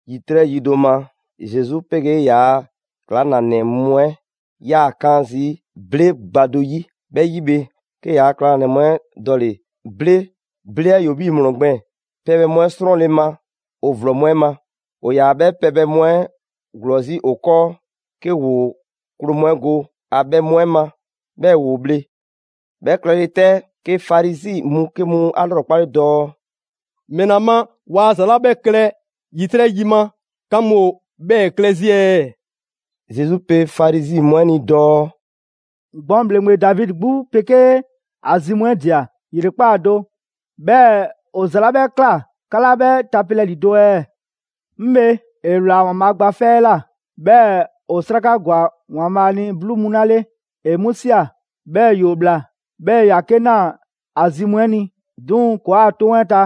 ‑Yitrɛ' yi do ma, Zesu 'pegee ‑yaa' ‑klaŋlanɛ mu 'ɛ 'yaa‑ 'kan zii' ble gba do 'yi. 'Bhɛ 'yi bhe, 'ke ‑yaa' ‑klaŋlanɛ mu 'ɛ dɔle‑ ble (ble 'ɛ ‑yoo 'bhii‑ ‑mlɔ gbɛɛn) pɛbhɛ mu 'ɛ 'srɔnle‑ ma ‑o ‑vlɔ mu 'ɛ ma. ‑O ‑yaa 'bhɛ pɛbhɛ mu 'ɛ ‑glɔɔ 'zi ‑o 'kɔɔ, 'ke ‑woo kloo mu 'ɛ go ‑a bhɛ mu 'ɛ ma, 'bhɛɛ‑ ‑woo bhle. 'Bhɛ klɛle 'tɛ, 'ke Farizi mu 'ke mu 'a 'lrɔkpale dɔɔ: «‑Mɛla ma waa ‑za 'la 'bhɛ klɛ ‑yitrɛ' yi ma, 'ka mu ‑o 'bhɛɛ‑ klɛ 'zi ɛɛ?» Zesu pe Farizi mu 'ɛ ni dɔɔ: «Gbɔn ‑bhleŋgbe Davidi 'gbu 'pegee ‑a zi mu 'ɛ ꞊dia ‑yrekpaa' do, 'bhɛɛ‑ ‑o ‑za 'la 'bhɛ ꞊kla 'ka 'laa 'bhɛ tapelɛ ‑lido' ɛɛ? 'Ŋ bhe, ‑e ‑wlaa ‑Waanbhaa' Gba 'Fɛ 'ɛ ꞊la, 'bhɛɛ‑ ‑o 'sraka ‑gwa ‑Waanbhaa' ni 'bluu mu 'la 'le, ‑e 'mu ꞊sia. 'Bhɛɛ‑ ‑yoo ꞊bhla, 'bhɛɛ‑ ‑yoo 'ke ꞊naa ‑a zi mu 'ɛ ni. 'Duŋ‑ ‑kɔɔa' 'toŋ 'ɛ ta,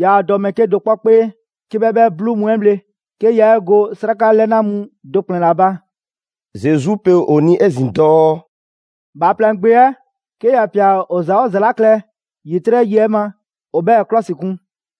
yaa dɔ mɛɛ ‑bhɛɛke' do kpɔ 'kpee 'ke 'bhɛ 'bhɛ 'bluu mu 'ɛ bhle, 'ke yaa 'e go 'sraka 'lɛna mu do ‑kplɛn ‑la ba.» Zesu pe ‑o ni 'ezin‑ dɔɔ: «Bhaaplɛŋ Gbe 'ɛ 'ke ‑ya ꞊pia ‑o ‑za 'oo ‑za 'la klɛ ‑yitrɛ' yi 'ɛ ma, ‑o 'bhɛɛ‑ ‑klɔsikun.»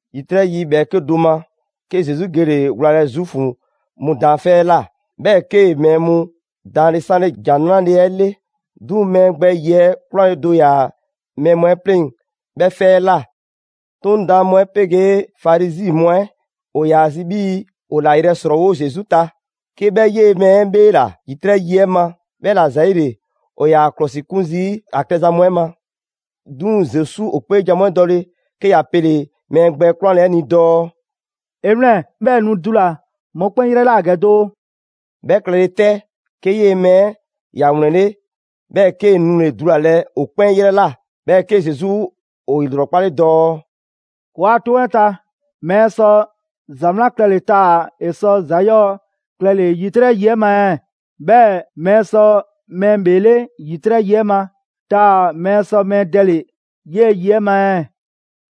‑Yitrɛ' yi ‑bhɛɛke' do ma, 'ke Zesu gele‑ wlalɛ Zuufu mu daanfɛ' 'ɛ ꞊la. 'Bhɛɛ‑ 'kee‑ mɛɛ mu daanle 'sanle ‑Jan 'Nrale‑ 'ɛ 'le. 'Duŋ‑ mɛɛ gbɛ ‑yiɛ' 'kwlanle‑ do ‑yaa mɛɛ mu 'ɛ 'pleŋ‑ 'bhɛ 'fɛ 'ɛ ꞊la. 'Toŋ daan mu 'ɛ 'pegee Farizi mu 'ɛ ‑o ‑yaa zi 'bhii‑ ‑o ‑la yrɛ ‑srɔɔwo' Zesu ta, 'ke 'bhɛ 'yee‑ mɛɛ 'ɛ 'bheela‑ ‑yitrɛ' yi 'ɛ ma. 'Bhɛla‑ ‑zɛɛle, ‑o ‑yaa ‑a 'klɔsikun zii' ‑a klɛza mu 'ɛ ma. 'Duŋ‑ Zesu ‑o 'kpeejan‑ mu 'ɛ dɔle, 'ke ‑ya pele‑ mɛɛ gbɛ 'kwlanle‑ 'ɛ ni dɔɔ: «'E 'wlɛn‑, 'bhɛɛ‑ nu dula‑ mɔkpɛn' 'yrɛ ꞊la ‑gɛ doo!» 'Bhɛ klɛle 'tɛ, 'ke 'yee‑ mɛɛ 'ɛ ‑ya ‑wlɛnle' 'bhɛɛ‑ 'kee‑ nule‑ dulalɛ ‑o 'kpɛn 'yrɛ ꞊la. 'Bhɛɛ‑ 'ke Zesu ‑o ‑lrɔkpale dɔɔ: «‑Kɔɔa' 'toŋ 'ɛ ta, mɛɛ sɔ ‑za 'wlan klɛle‑ taa‑ ‑e sɔ ‑za 'yɔɔ‑ klɛle‑ ‑yitrɛ' yi 'ɛ ma ɛɛ? 'Bhɛɛ‑ mɛɛ sɔ mɛɛ ‑bheele' ‑yitrɛ' yi 'ɛ ma, taa‑ mɛɛ sɔ mɛɛ dɛle‑ 'yee‑ yi 'ɛ ma ɛɛ?»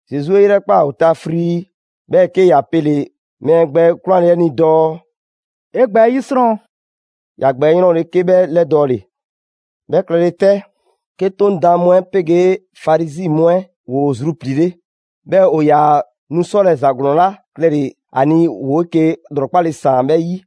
Zesu 'e 'yrɛkpaa‑ ‑o ta frii, 'bhɛɛ‑ 'ke ‑ya pele‑ mɛɛ gbɛ 'kwlanle‑ 'ɛ ni dɔɔ: «'E gbɛ 'ɛ 'yisrɔn!» ‑Ya gbɛ 'ɛ 'yrɔnle‑ 'ke 'bhɛ 'lɛdɔɔle. 'Bhɛ klɛle 'tɛ, 'ke 'Toŋ daan mu 'ɛ 'pegee Farizi mu 'ɛ ‑woo zrupliile. 'Bhɛɛ‑ ‑o ‑yaa nu 'sɔlɛ‑ ‑za ‑glɔɔn 'la klɛle‑ ‑a ni, ‑woo 'eke‑ ‑lrɔkpale ‑saan 'bhɛ 'yi.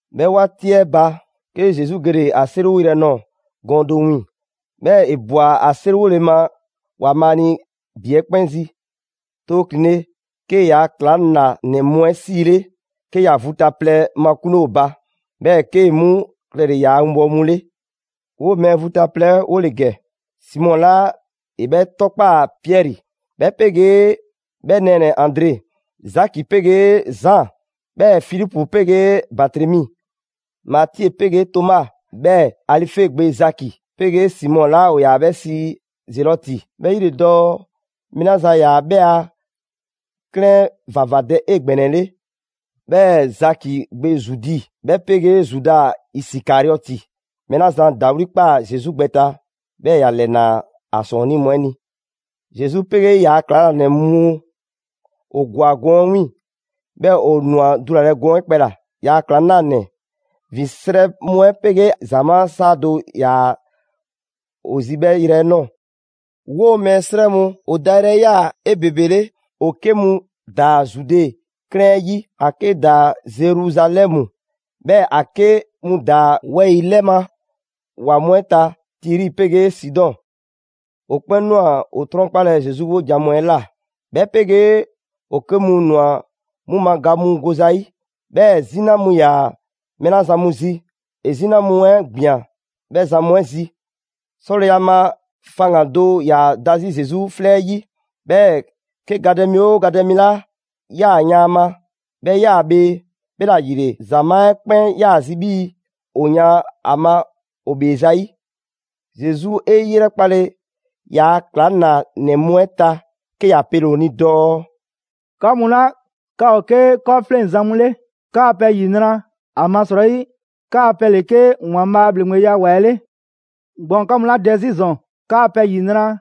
'Bhɛ 'waati 'ɛ ba, 'ke Zesu gele‑ ‑a 'seriwoyrɛ nɔɔ‑ gɔɔn do 'wiiŋ‑. 'Bhɛɛ‑ ‑e ꞊bwa ‑a 'seriwole ma ‑Waanbhaa' ni ‑bi 'ɛ 'kpɛn zi. Too ‑klinle', 'kee‑ ‑yaa' ‑klaŋlanɛ mu 'ɛ 'siile, 'ke ‑ya vu ta plɛ makunle ‑o ba, 'bhɛɛ‑ 'kee‑ 'mu klɛle‑ ‑yaa' winbɔwo mu 'le. 'Woo‑ mɛɛ vu ta plɛ 'ɛ 'wo ‑le ‑gɛ: Simɔ 'la ‑e 'bhɛ 'tɔkpaa‑ Piɛri, 'bhɛ 'pegee 'bhɛ nɛɛnɛ‑ Andre, Zaki 'pegee Zaan, 'bhɛɛ‑ Filipu 'pegee Batremi. Matie 'pegee Toma, 'bhɛɛ‑ Alife gbe Zaki 'pegee Simɔ 'la ‑o ‑yaa 'bhɛ sii Zelɔti, 'bhɛ 'yi ‑le dɔɔ mɛɛ 'la zan ‑yaa 'bhɛ a 'klɛɛn 'ɛ ‑vavadɛ 'egbɛnɛle. 'Bhɛɛ‑ Zaki gbe Zudi, 'bhɛ 'pegee Zuda Isikariɔti, mɛɛ 'la zan ‑dawli' ꞊kpaa Zesu gbɛ ta, 'bhɛɛ‑ ‑ya ‑lɛnaa ‑a ‑sɔɔnnii' mu 'ɛ ni. Zesu 'pegee ‑yaa' ‑klaŋlanɛ mu ‑o ‑gwa gɔɔn 'ɛ 'wiiŋ‑, 'bhɛɛ‑ ‑o ‑nwa dulalɛ gɔɔn 'ɛ kpɛla‑. ‑Yaa' ‑klaŋlanɛ ‑vin 'srɛ mu 'ɛ 'pegee ‑zamaa' 'saa do ‑yaa ‑o zi 'bhɛ yrɛ 'ɛ 'nɔɔ‑. 'Woo‑ mɛɛ 'srɛ mu ‑o dayrɛ 'ɛ ꞊yaa 'ebebele: ‑o 'ke mu ‑daa Zude 'klɛɛn 'yi, ‑a 'ke ‑daa Zeruzalɛmu, 'bhɛɛ‑ ‑a 'ke mu ‑daa wɛyi‑ 'lɛ ma ‑wa mu 'ɛ ta, Tiri 'pegee Sidɔn. ‑O 'kpɛn ꞊nwa ‑o 'trɔnkpalɛ Zesu 'wojan‑ mu 'ɛ ꞊la, 'bhɛ 'pegee ‑o 'ke mu ꞊nwa 'mu ma ga mu go zayi'. 'Bhɛɛ‑ 'zina mu 'yaa‑ mɛɛ 'la zan mu zi, ‑e 'zina mu 'ɛ ꞊gbian 'bhɛ zan mu 'ɛ zi. 'Sɔleya ma faŋgan‑ do ‑yaa da 'zi Zesu 'flɛ 'ɛ 'yi, 'bhɛɛ‑ 'ke gadɛ mi 'oo gadɛ mi 'la ꞊yaa yan ‑a ma, 'bhɛ ꞊yaa bhee. 'Bhɛla‑ ‑yile, ‑zamaa' 'ɛ 'kpɛn ꞊yaa zi 'bhii‑ ‑o yan ‑a ma ‑o ‑bhee zayi'. Zesu 'e 'yrɛkpale ‑yaa' ‑klaŋlanɛ mu 'ɛ ta, 'ke ‑ya pele‑ ‑o ni dɔɔ: «'Ka mu 'la 'ka ‑o 'ke 'kɔɔfleŋzan mu 'le, 'kaa‑ pɛ ‑yinra'! ‑Amasrɔyi 'kaa pɛ ‑le 'ke ‑Waanbhaa' a ‑bhleŋgbeya ‑wa 'ɛ 'le. Gbɔn ‑o 'ka mu 'la dɛ 'zi ‑zɔn, 'kaa‑ pɛ ‑yinra'!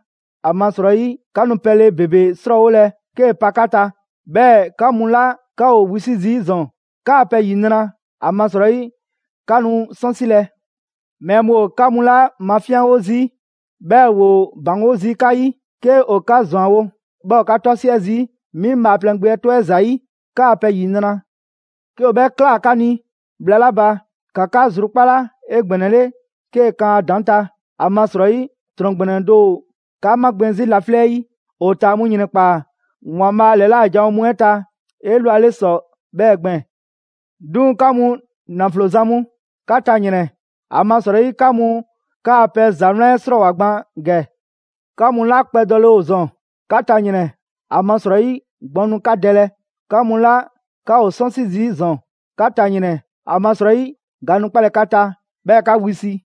‑Amasrɔyi 'ka nu pɛle ‑bebe 'srɔɔwolɛ 'kee‑ pa 'ka ta. 'Bhɛɛ‑ 'ka mu 'la 'ka ‑o wisi' zii' ‑zɔn, 'kaa‑ pɛ ‑yinra'! ‑Amasrɔyi 'ka nu 'sɔnsilɛ.» «Mɛɛ mu ‑o 'ka mu 'la mafinyanwo zii', 'bhɛɛ‑ ‑woo ‑baŋgo' zii' 'ka 'yi, 'ke ‑o 'ka ‑zwanwo', 'bhɛɛ‑ ‑o 'ka 'tɔsiɛ zii' 'mi Bhaaplɛŋ Gbe 'ɛ 'tɔ 'ɛ ‑zayi', 'kaa‑ pɛ ‑yinra'! 'Ke ‑o 'bhɛ ꞊kla 'ka ni bhla 'la ba, ‑ka 'ka zrukpala 'egbɛnɛle 'kee‑ kan ‑a ‑daŋ' ta. ‑Amasrɔyi, ‑trɔn ‑gbɛnɛ do ‑o 'ka 'magbɛn‑ 'zi laflɛ' yi. ‑O ‑taa mu ‑yrɛnkpaa ‑Waanbhaa' ‑lɛla' janwo mu 'ɛ ta 'elwale ‑sɔ 'bhɛɛ‑ gbɛɛn‑. 'Duŋ‑ 'ka mu ‑naflo zan mu, 'ka ta ‑yrɛn! ‑Amasrɔyi 'ka mu 'kaa‑ pɛ ‑za 'wlan 'ɛ 'srɔɔwoa‑ gban ‑gɛ. 'Ka mu 'la kpɛdɔle ‑o ‑zɔn, 'ka ta ‑yrɛn! ‑Amasrɔyi gbɔn nu 'ka dɛlɛ! 'Ka mu 'la 'ka ‑o 'sɔnsi zii' ‑zɔn, 'ka ta ‑yrɛn! ‑Amasrɔyi ga nu 'kpalɛ‑ 'ka ta, 'bhɛɛ‑ 'ka wisi.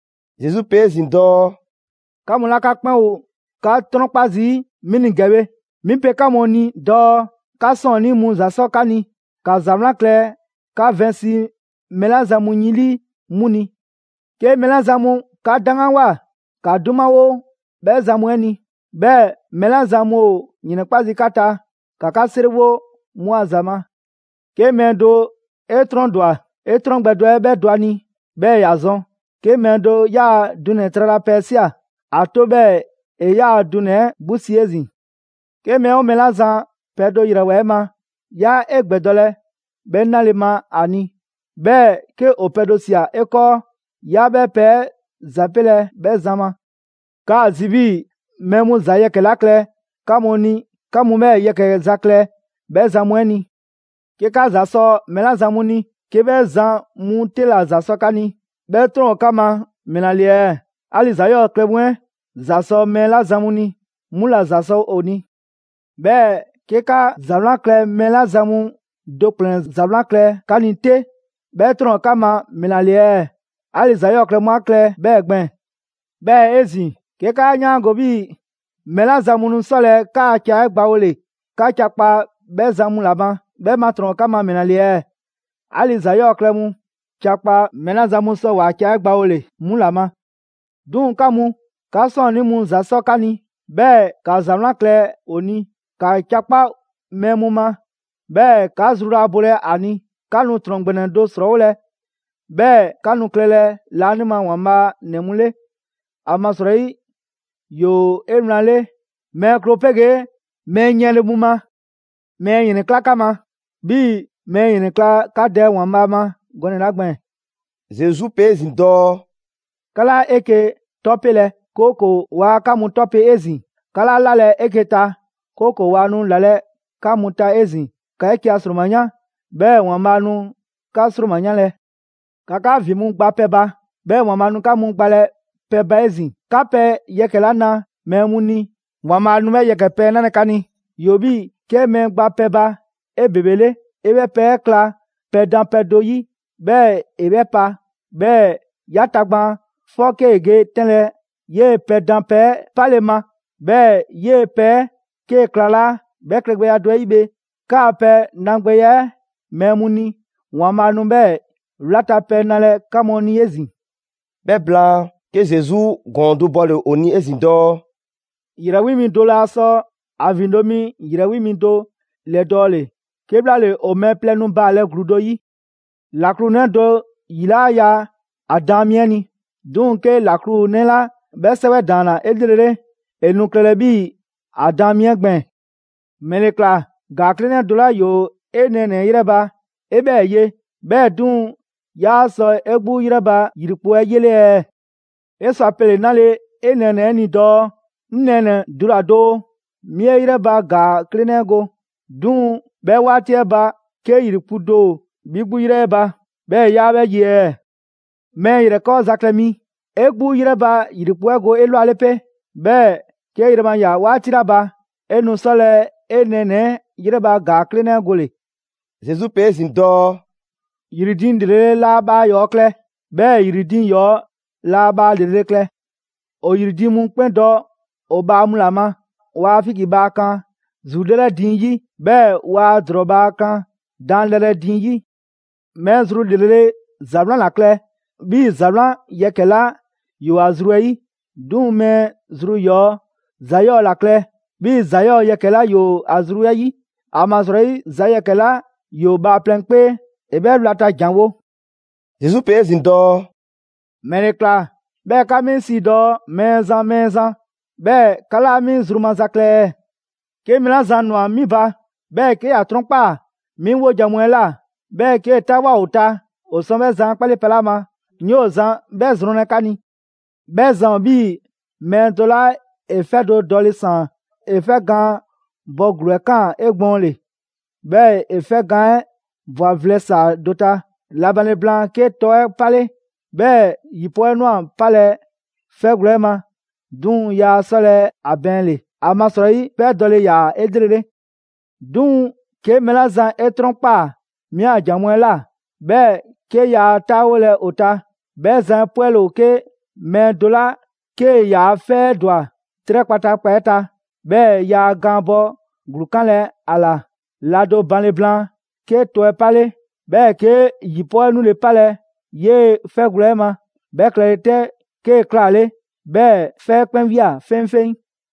Zesu pe 'ezin‑ dɔɔ: «'Ka mu 'la 'ka 'kpɛn ‑o 'ka 'trɔnkpa zii' 'mi ni ‑gɛ bhe, 'mi pe 'ka mu ni dɔɔ 'ka 'sɔɔnnii mu ‑za 'sɔ 'ka ni. ‑Ka ‑za 'wlan klɛ 'ka vɛnsi mɛɛ 'la zan mu yin 'lii 'mu ni. 'Ke mɛɛ 'la zan mu 'ka 'daŋganwoa ‑ka 'dumawo 'bhɛ zan mu 'ɛ ni. 'Bhɛɛ‑ mɛɛ 'la zan mu ‑o ‑yrɛnkpa' zii' 'ka ta, ‑ka 'ka 'seriwo 'mu a ‑za ma. 'Ke mɛɛ do 'e 'trɔn do ‑dwa, 'e 'trɔn gbɛ do 'ɛ 'bhɛ dɔ ‑a ni 'bhɛɛ‑ ‑ya zɔn. 'Ke mɛɛ do 'yaa‑ dunɛ‑ tralapɛ 'ɛ ꞊sia, ‑a 'to 'bhɛɛ‑ ‑e 'yaa‑ dunɛ‑ 'ɛ 'gbu 'si 'ezin‑. 'Ke mɛɛ 'oo mɛɛ 'la zan pɛ do ‑yrɛwoa 'e ma, 'yaa 'e ‑gbɛdɔlɛ 'bhɛ 'nale‑ ma ‑a ni. 'Bhɛɛ‑ 'ke ‑o pɛ do ꞊sia 'e 'kɔɔ, 'yaa 'bhɛ pɛ 'ɛ ‑zapelɛ 'bhɛ zan ma. 'Kaa‑ zi 'bhii‑ mɛɛ mu ‑za yɛkɛ‑ 'la klɛ 'ka mu ni 'ka mu 'bhɛɛ‑ yɛkɛ‑ za klɛ 'bhɛ zan mu 'ɛ ni. 'Ke 'ka ‑za sɔ mɛɛ 'la zan mu ni, 'ke 'bhɛ zan mu 'te ‑la ‑za sɔ 'ka ni, 'bhɛ ‑trɔn ‑o 'ka ma ‑mɛla ‑le ɛɛ? 'Ali‑ ‑za 'yɔɔ‑ klɛ mu 'ɛ ‑za sɔ mɛɛ 'la zan mu ni, 'mu ‑la ‑za sɔ ‑o ni 'Bhɛɛ‑ 'ke 'ka ‑za 'wlan klɛ mɛɛ 'la zan mu do ‑kplɛn ‑za 'wlan klɛ 'ka ni 'te, 'bhɛ 'trɔn ‑o 'ka ma ‑mɛla ‑le ɛɛ? 'Ali‑ ‑za 'yɔɔ‑ klɛ mu 'a klɛ 'bhɛɛ‑ gbɛɛn‑. 'Bhɛɛ‑ 'ezin‑, 'ke 'kaa 'yaango‑ 'bhii‑ mɛɛ 'la zan mu nu 'sɔlɛ‑ 'kaa‑ ca 'ɛ gbawole 'ka ca kpa 'bhɛ zan mu ‑la ma, 'bhɛ ma ‑trɔn ‑o 'ka ma ‑mɛla ‑le ɛɛ? 'Ali‑ ‑za 'yɔɔ‑ klɛ mu ca kpa mɛɛ 'la zan mu sɔ ‑waa' ca 'ɛ gbawole 'mu ‑la ma. 'Duŋ‑ 'ka mu, 'ka 'sɔɔnnii mu ‑za 'sɔ 'ka ni. 'Bhɛɛ‑ ‑ka ‑za 'wlan klɛ ‑o ni. ‑Ka ca 'kpa mɛɛ mu ma, 'bhɛɛ‑ 'ka zru laa bolɛ a ni. 'Ka nu ‑trɔn ‑gbɛnɛ do ‑srɔɔwolɛ, 'bhɛɛ‑ 'ka nu klɛlɛ laanima ‑Waanbhaa' ‑nɛ mu 'le. ‑Amasrɔyi ‑yoo 'ewlanle mɛɛ kloo 'pegee mɛɛ yiɛnle mu ma. Mɛɛ ‑yrɛnkla' 'ka ma, 'bhii‑ mɛɛ ‑yrɛnkla' 'ka Dɛ ‑Waanbhaa' ma gɔnɛ‑ 'la gbɛɛn‑.» Zesu pe 'ezin‑ dɔɔ: «'Ka 'laa 'eke‑ 'tɔpelɛ, 'kooko‑ waa 'ka mu 'tɔpe 'ezin‑. 'Ka 'laa 'lalɛ‑ 'eke‑ ta, 'kooko‑ waa nu ‑lalɛ' 'ka mu ta 'ezin‑. ‑Ka 'eke‑ a ‑sroma 'yan, 'bhɛɛ‑ ‑Waanbhaa' nu 'kaa ‑sroma 'yanlɛ‑. ‑Ka 'ka ‑vin mu gba pɛ ba, 'bhɛɛ‑ ‑Waanbhaa' nu 'ka mu gbalɛ pɛ ba 'ezin‑. 'Ka pɛ yɛkɛ‑ 'la ꞊naa mɛɛ mu ni, ‑Waanbhaa' nu 'bhɛɛ‑ yɛkɛ‑ pɛ 'ɛ 'nalɛ‑ 'ka ni. ‑Yoo 'bhii‑ 'kee‑ mɛɛ gba pɛ ba 'ebebele, 'e 'bhɛ pɛ 'ɛ kla pɛdanpɛ do 'yi, 'bhɛɛ‑ 'e 'bhɛ pa. 'Bhɛɛ‑ 'ya tagbaan 'fɔ 'kee‑ ge 'tɛnlɛ‑ 'yee‑ pɛdanpɛ 'ɛ 'pale‑ ma, 'bhɛɛ‑ 'yee‑ pɛ 'ɛ 'ke klalaa'. 'Bhɛ klɛgbɛya do 'ɛ 'yi bhe, 'kaa‑ pɛ nagbɛya 'ɛ mɛɛ mu ni, ‑Waanbhaa' nu 'bhɛɛ‑ wlata pɛ nalɛ 'ka mu ni 'ezin‑.» 'Bhɛ blaan, 'ke Zesu ‑gɔɔn do bɔle‑ ‑o ni 'ezin‑ dɔɔ: «‑Yrɛ wi mi do laa sɔ ‑a ‑vindo' mi ‑yrɛ wi mi do ‑lɛdɔɔle, 'kebhlaale ‑o mɛɛ plɛ nu baalɛ ‑gluu do 'yi. ‑Laklu 'nɛ do ‑yi 'laa ya ‑a daan mi 'ɛ ni. 'Duŋ‑ 'ke ‑laklu 'nɛ 'la 'bhɛ 'sɛwɛ ‑daanna 'elrele, ‑e nu klɛlɛ 'bhii‑ ‑a daan mi 'ɛ gbɛɛn‑. ‑Mɛle ꞊kla ‑gaa 'klenɛ do 'la ‑yoo 'e nɛɛnɛ‑ 'ɛ ‑yrɛ ba, 'e 'bhɛɛ‑ ye, 'bhɛɛ‑ 'duŋ‑ 'yaa‑ sɔ 'e 'gbu 'yrɛ ba ‑yrikpu' 'ɛ 'yele ɛɛ? 'E sɔ a pele‑ 'nale‑ 'e nɛɛnɛ‑ 'ɛ ni dɔɔ: ‹'Ŋ nɛɛnɛ‑, dula‑ doo, 'mi 'e 'yrɛ ba ‑gaa 'klelenɛ go.› 'Duŋ‑ 'bhɛ 'waati 'ɛ ba 'ke ‑yrikpu' do ‑o 'bhi 'gbu ‑yrɛ 'ɛ ba, 'bhɛɛ‑ 'yaa 'bhɛ ye ɛɛ? Mɛɛ ‑yrɛkɔɔza klɛ mi, 'e 'gbu 'yrɛ ba ‑yrikpu' 'ɛ go 'elwale 'pe, 'bhɛɛ‑ 'kee‑ yrɛ ma ꞊ya 'waati 'la ba, 'e nu 'sɔlɛ‑ 'e nɛɛnɛ‑ 'ɛ 'yrɛ ba ‑gaa 'klenɛ 'ɛ gole‑.» Zesu pe 'ezin‑ dɔɔ: «‑Yri diiŋ ‑lrele' laa bhaa ‑yɔɔ klɛ, 'bhɛɛ‑ ‑yri diiŋ ‑yɔɔ' laa bhaa ‑lrele' klɛ. ‑O ‑yri diiŋ mu 'kpɛn dɔ ‑o bhaa mu ‑la ma. Waa figi bhaa kan ‑zulɛrɛ diiŋ 'yi. 'Bhɛɛ‑ waa ‑drɔɔ bhaa kan daanlɛrɛ diiŋ 'yi. Mɛɛ zru ‑lrele' ‑za 'wlan ‑la klɛ 'bhii‑ ‑za 'wlan yɛkɛ‑ 'la ‑yoo ‑a zru 'ɛ 'yi; 'duŋ‑ mɛɛ zru ‑yɔɔ' ‑za 'yɔɔ‑ ‑la klɛ 'bhii‑ ‑za 'yɔɔ‑ yɛkɛ‑ 'la ‑yoo ‑a zru 'ɛ 'yi. ‑Amasrɔyi ‑za yɛkɛ‑ 'la ‑yoo bhaaplɛŋ 'kpee, ‑e 'bhɛɛ‑ wlata ‑janwo'.» Zesu pe 'ezin‑ dɔɔ: «‑Mɛle ‑kla 'bhɛɛ‑ 'ka 'mi sii dɔɔ: Mɛɛzan, Mɛɛzan, 'bhɛɛ‑ 'ka 'laa 'mi zru maza klɛ ɛɛ? 'Ke mɛɛ 'la zan ‑nwa 'mi ba, 'bhɛɛ‑ 'ke ‑ya 'trɔnkpaa‑ 'mi 'wojan‑ mu 'ɛ ꞊la, 'bhɛɛ‑ 'kee‑ 'taawoa꞊ ‑o ta, ‑o sɔ 'bhɛ zan 'ɛ 'kpale pɛ 'la ma, 'ŋ 'yoo‑ zan 'bhɛ zrɔnlɛ 'ka ni. 'Bhɛ zan ‑o 'bhii‑ mɛɛ do 'la ‑e 'fɛ do dɔle‑ ‑saan. ‑E 'fɛ gaan bɔ ‑gluu 'ɛ ꞊kaan 'egbɔɔnle, 'bhɛɛ‑ ‑e 'fɛ gaan 'ɛ ꞊bwa vlɛ ‑saa do ta. La banle blaan 'ke tɔ 'ɛ 'pale, 'bhɛɛ‑ ‑yi 'pɔɔ 'ɛ ꞊nwa 'palɛ‑ 'fɛgwlɛ‑ ma, 'duŋ‑ yaa 'sɔlɛ‑ ‑a bɛɛnle‑. ‑Amasrɔyi 'fɛ 'ɛ dɔle‑ ‑yaa 'elrele. 'Duŋ‑ 'ke mɛɛ 'la zan 'e 'trɔnkpaa‑ 'mi a ‑jan mu 'ɛ ꞊la, 'bhɛɛ‑ 'ke yaa 'taawolɛ ‑o ta, 'bhɛ zan 'ɛ 'pwɛle ‑o 'ke mɛɛ do 'la 'kee‑ ‑yaa' 'fɛ 'ɛ ‑dwa 'trɛ kpataakpa 'ɛ ta, 'bhɛɛ‑ yaa gaan bɔ ‑gluu 'kanlɛ‑ ‑a ‑la. La do banle blaan, 'ke tɔ 'ɛ 'pale, 'bhɛɛ‑ 'ke ‑yi 'pɔɔ 'ɛ 'nule 'palɛ‑ 'yee‑ 'fɛgwlɛ‑ 'ɛ ma. 'Bhɛ klɛle 'tɛ, 'kee‑ 'klaale 'bhɛɛ‑ 'fɛ 'ɛ 'kpɛn ꞊wia 'feŋfeŋ.»